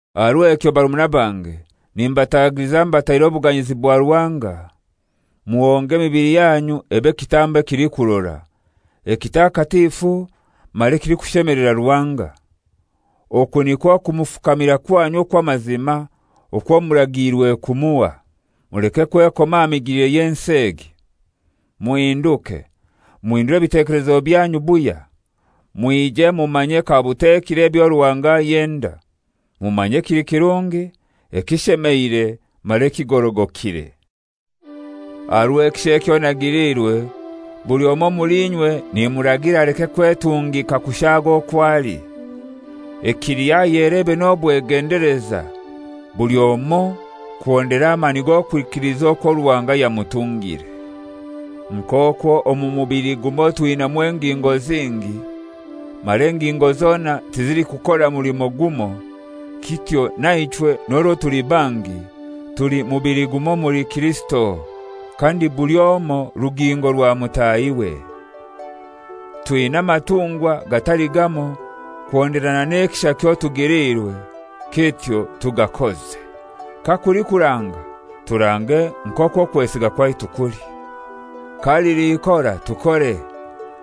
Aha rw'ekyo barumuna bange, nimbatagiliza mbataireho obuganyizi bwa Ruhanga, muhonge emibili yanyu ebe kitambo ekilikurora, ekitakatifu mara ekilikushemelera Ruhanga. Oku nikwo kumufukamira kwanyu okw'amazima okwo muragiirwe kumuha. Muleke kwekoma aha migilire y'ensi egi. Muhinduke, muhindure ebitekelezo byanyu buhya, mwije mumanye kabutekire ebyo Ruhanga ayenda, mumanye ekili kirungi, ekishemeire mara ekigorogokire. Aha rw'ekisha ekyo nagiliirwe, buli omoi omuli inywe nimuragira aleke kwetungika kushaaga okwo ali, ekiliho ayelebe n'obwegendeleza, buli omoi kuhondera amani g'okwikiliza okwo Ruhanga yamutungire. Nk'okwo omu mubili gumoi twinamu engingo zingi, mara engingo zona tizilikukora mulimo gumoi, kityo naichwe n'orwo tuli bangi, tuli mubili gumoi omuli Kirisito, kandi buli omoi rugingo rwa mutahiwe. Twina amatungwa gatali gamoi kuhonderana n'ekisha kyotugiliirwe, kityo tugakoze. Kakuli kuranga, turange nk'okwo okwesiga kwaitu kuli. Kalili ikora, tukore,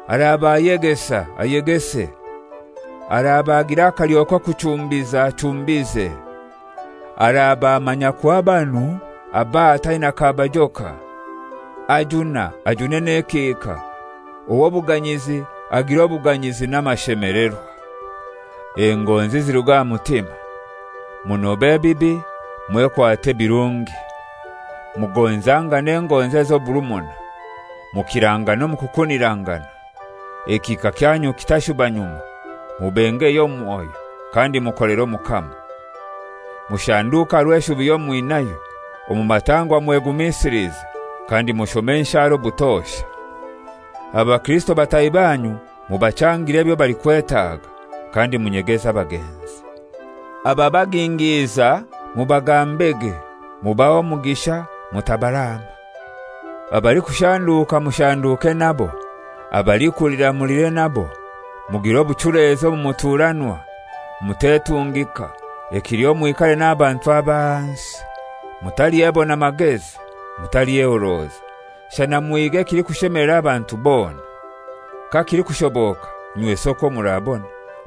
araba ayegesa, ayegese. Araba agira akalyo k'okuchumbiza, achumbize; araba amanya kuha banu, abahe ataina kabajoka. Ajuna, ajune n'ekihika; ow'obuganyizi, agire obuganyizi n'amashemelerwa. Engonzi ziruge aha mutima. Munobe ebibi, mwekwate ebirungi. Mugonzangane engonzi ez'oburumuna; mukirangane omu kukunirangana. Ekihika kyanyu kitashuba nyuma; mubengeye omu mwoyo, kandi mukolere Omukama. Mushanduke aha rw'eshubi yomwinayo, omu matangwa mwegumisilize, kandi mushome enshara obutosha. Abakirisito bataahi banyu mubachangire ebyo balikwetaga, kandi munyegeze abagenzi. Ababagingiiza mubagambege; mubahe omugisha, mutabaraama. Abalikushanduuka mushanduuke nabo, abalikulira mulire nabo. Mugire obuchulezi omu muturanwa; mutetungika, ekiliho mwikare n'abantu ab'ahansi. Mutalyebona magezi. Mutalyehoroza, shana muhige ekilikushemelera abantu bona. Kakilikushoboka, inywesi okwo murabona,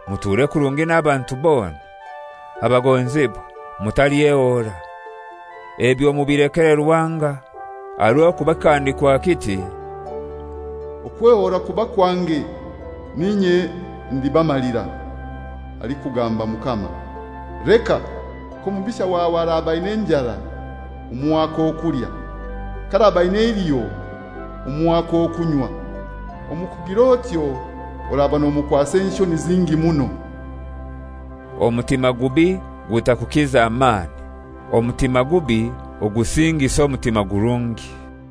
muture kurungi n'abantu bona. Abagonzibwa, mutalyehoora; ebyo mubilekere Ruhanga, aha rw'okuba kikahandikwa kiti, «Okwehoora kuba kwange, n'inye ndibamalira, alikugamba Mukama. Leka! K'omubisha wawe araba aina enjara, omuhe ak'okulya; k'araba aina eiliho, omuhe ak'okunywa. Omu kugir'otyo oraba nomukwasa enshoni zingi muno.» Omutima gubi gutakukiza mani; omutima gubi ogusingise omutima gurungi.